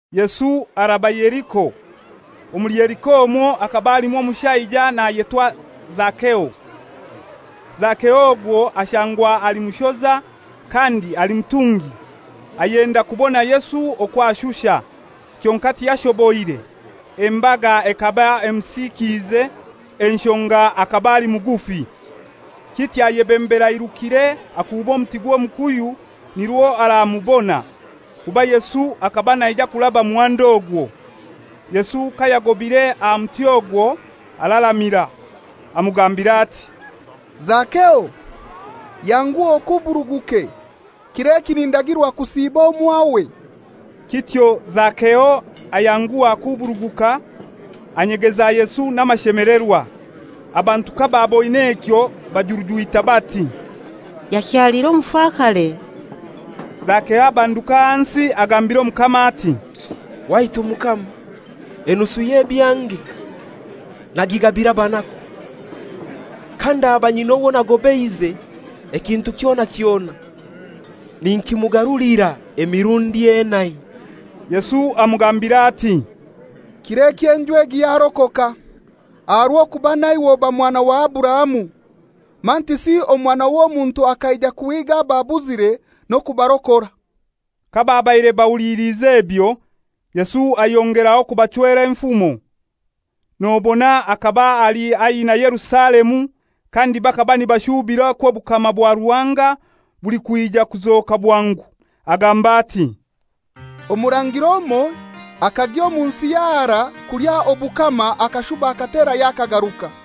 Yesu araba Yeriko. Omuli Yeriko omwo hakaba halimu omushaija nayetwa Zakeo. Zakeo ogwo ashangwa ali mushoza, kandi ali mutungi. Ayenda kubona Yesu okwo ashusha, kyonkai tiyashoboire; embaga ekaba emusikiize, enshonga akaba ali mugufi. Kityo ayebembera airukire akuuba omuti gw'omukuyu nirwo aramubona, kuba Yesu akaba naija kuraba muhanda ogwo. Yesu kayagobire aha muti ogwo araramira, amugambira ati, «Zakeo, yanguha okuburuguke; kir'eki nindagirwa kusiiba omwawe.» Kityo Zakeo ayanguha akuburuguka, anyegeza Yesu n'amashemelerwa. Abantu kabaaboine ekyo bajurujwita bati, «Yakyalira omufakare.» Zakeo abanduka ahansi agambira Omukama ati, «Waitu Mukama, enusu y'ebyange nagigabira abanaku. Kandaba nyina owo nagobeize ekintu kyona kyona, ninkimugarulira emirundi enai.» Yesu amugambira ati, «Kir'eki enju egi yarokoka, aha rw'okuba naiwe oba mwana wa Aburahamu. Mantisi Omwana w'Omuntu akaija kuhiiga ababuzire n'okubarokora.» Kababaire bahuliliize ebyo, Yesu ayongeraho kubachwera enfumo, nobona akaba ali haihi na Yerusalemu, kandi bakaba nibashubira okwo obukama bwa Ruhanga bulikwija kuzoka bwangu. Agamba ati, «Omurangira omoi akagya omu nsi y'aharai kulya obukama akashuba akaterayo akagaruka.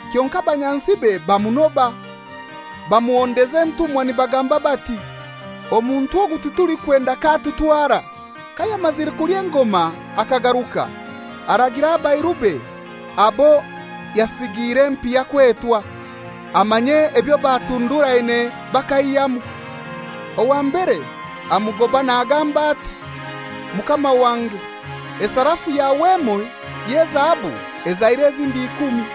Kyonkai abanyansibe bamunoba, bamuhondeza entumwa nibagamba bati, ‹Omuntu ogu titulikwenda k'atutwara.› Kayamazire kulya engoma akagaruka, aragira abairube abo yasigiire empiha kwetwa, amanye ebyo batunduraine bakaihyamu. Owa mbere amugoba nagamba ati, ‹Mukama wange, esarafu yawe emoi y'ezahabu ezaire ezindi ikumi.›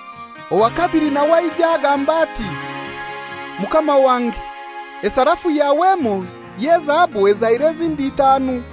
Owa kabili nawe aija agamba ati, ‹Mukama wange, esarafu yawe emoi y'ezahabu ezaire ezindi itaanu.›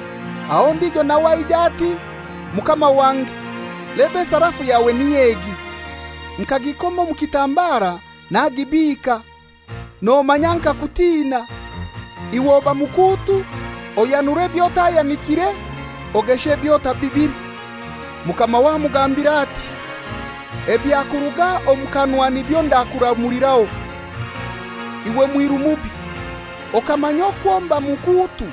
Aho ondijo nawe aija, ati, ‹Mukama wange, leba esarafu yawe niy'egi! Nkagikoma omu kitambara nagibiika. Nomanya nkakutina. Iwe oba mukuutu, oyanura eby'otayanikire, ogesha eby'otabibire.› Mukamawe amugambira ati, ‹Ebyakuruga omu kanwa nibyo ndakuramuliraho, iwe mwiru mubi! Okamanya okwo mba mukuutu,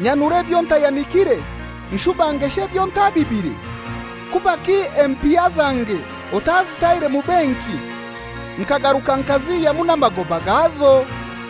nyanura ebyo ntayanikiire, nshuba ngesha ebyo ntabibire? Kubaki empiha zange otazitaire mu benki, nkagaruka nkazihyamu n'amagoba gazo?›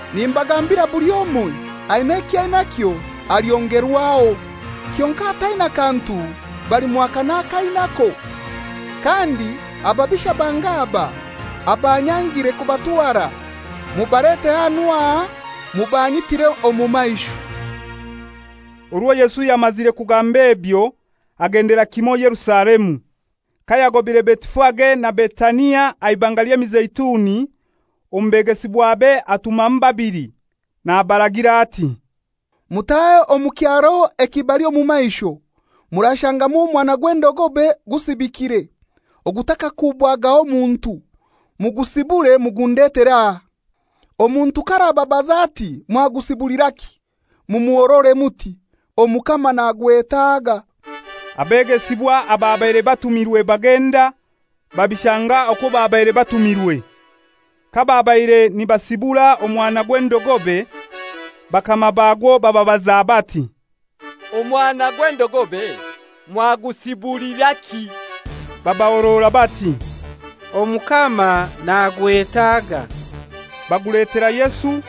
‹Nimbagambira buli omoi aina ekyo ainakyo alyongerwaho. Kyonkai ataina kantu, balimwaka n'akainako. Kandi ababisha bange aba, abanyangire kubatwara, mubalete hanu aha mubanyitire omu maisho.›» Orwo Yesu yamazire kugamba ebyo, agendera kimo, Yerusalemu. Kayagobire Betifage na Betania aha Ibanga ly'Emizeituni, omu begesibwabe atumamu babili, nabaragira ati, «Mutahe omu kyaro ekibali omu maisho, murashangamu omwana gw'endogobe gusibikire, ogutakakubwagaho muntu, mugusibure mugundetere aha. Omuntu k'arababaza ati, ‹Mwagusibuliraki?› Mumuhorore muti, ‹Omukama nagwetaaga.›» Abegesibwa ababaire batumirwe bagenda, babishanga okwo babaire batumirwe. Kababaire nibasibura omwana gw'endogobe, bakama bagwo bababaza bati, «Omwana gw'endogobe mwagusibuliraki?» Babahorora bati, «Omukama nagwetaaga.» Baguletera Yesu,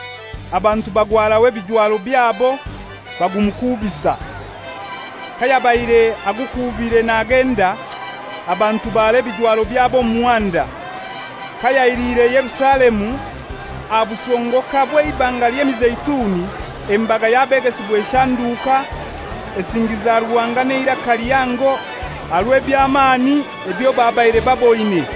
abantu bagwaraho ebijwaro byabo, bagumukuubisa. Kayabaire agukuubire nagenda, abantu bara ebijwaro byabo omu muhanda. Kayailiire Yerusalemu aha busongoka bw'Eibanga ly'Emizeituni, embaga y'abegesibwa eshanduka, esingiza Ruhanga n'eiraka lihango aha rw'eby'amani ebyo babaire baboine,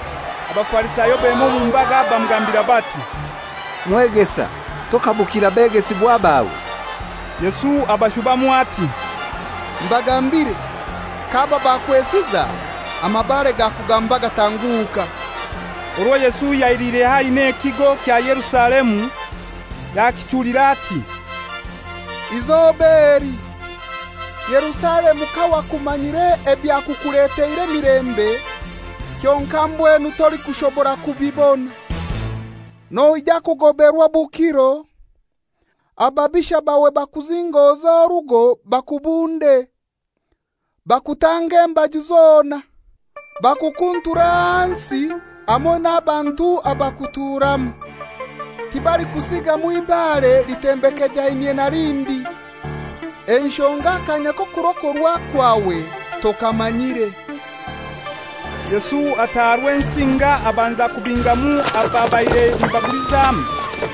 Abafarisayo bema omu mbaga bamugambira bati, «Mwegesa, tokabukira begesibwa bawe?» Yesu abashubamu ati, «Mbagambire, k'aba bakwesiza, amabare gakugamba gatanguka.» Orwo Yesu yailiire haihi ekigo kya Yerusalemu, yakichulira ati, «Izoba eli, Yerusalemu kawakumanyire ebyakukuleteire emilembe! Kyonkai mbwenu tolikushobora kubibona. Noija kugoberwa obukiro, ababisha bawe bakuzingoze orugo bakubunde, bakutange embaju zona, bakukunture ahansi hamoi n'abantu abakuturamu, tibalikusigamu ibare litembekejainyie na lindi, enshonga akanya k'okurokorwa kwawe tokamanyire.» Yesu ataaha Rwensinga abanza kubingamu ababaire nibagulizamu,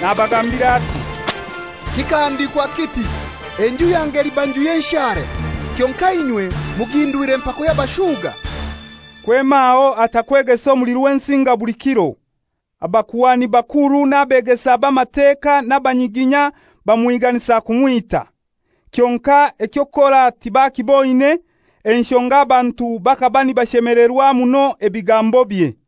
nabagambira ati, «Kikahandikwa kiti, ‹Enju yange eliba nju y'enshara;› kyonkai inywe mugihindwire mpako y'abashuga.» Kwema aho ata kwegesa omuli Rwensinga buli kiro. Abakuhani bakuru n'abeegesa b'Amateka n'abanyiginya bamuhiganisa kumwita. Kyonkai eky'okukora tibakiboine, enshonga abantu bakaba nibashemelerwa muno ebigambobye.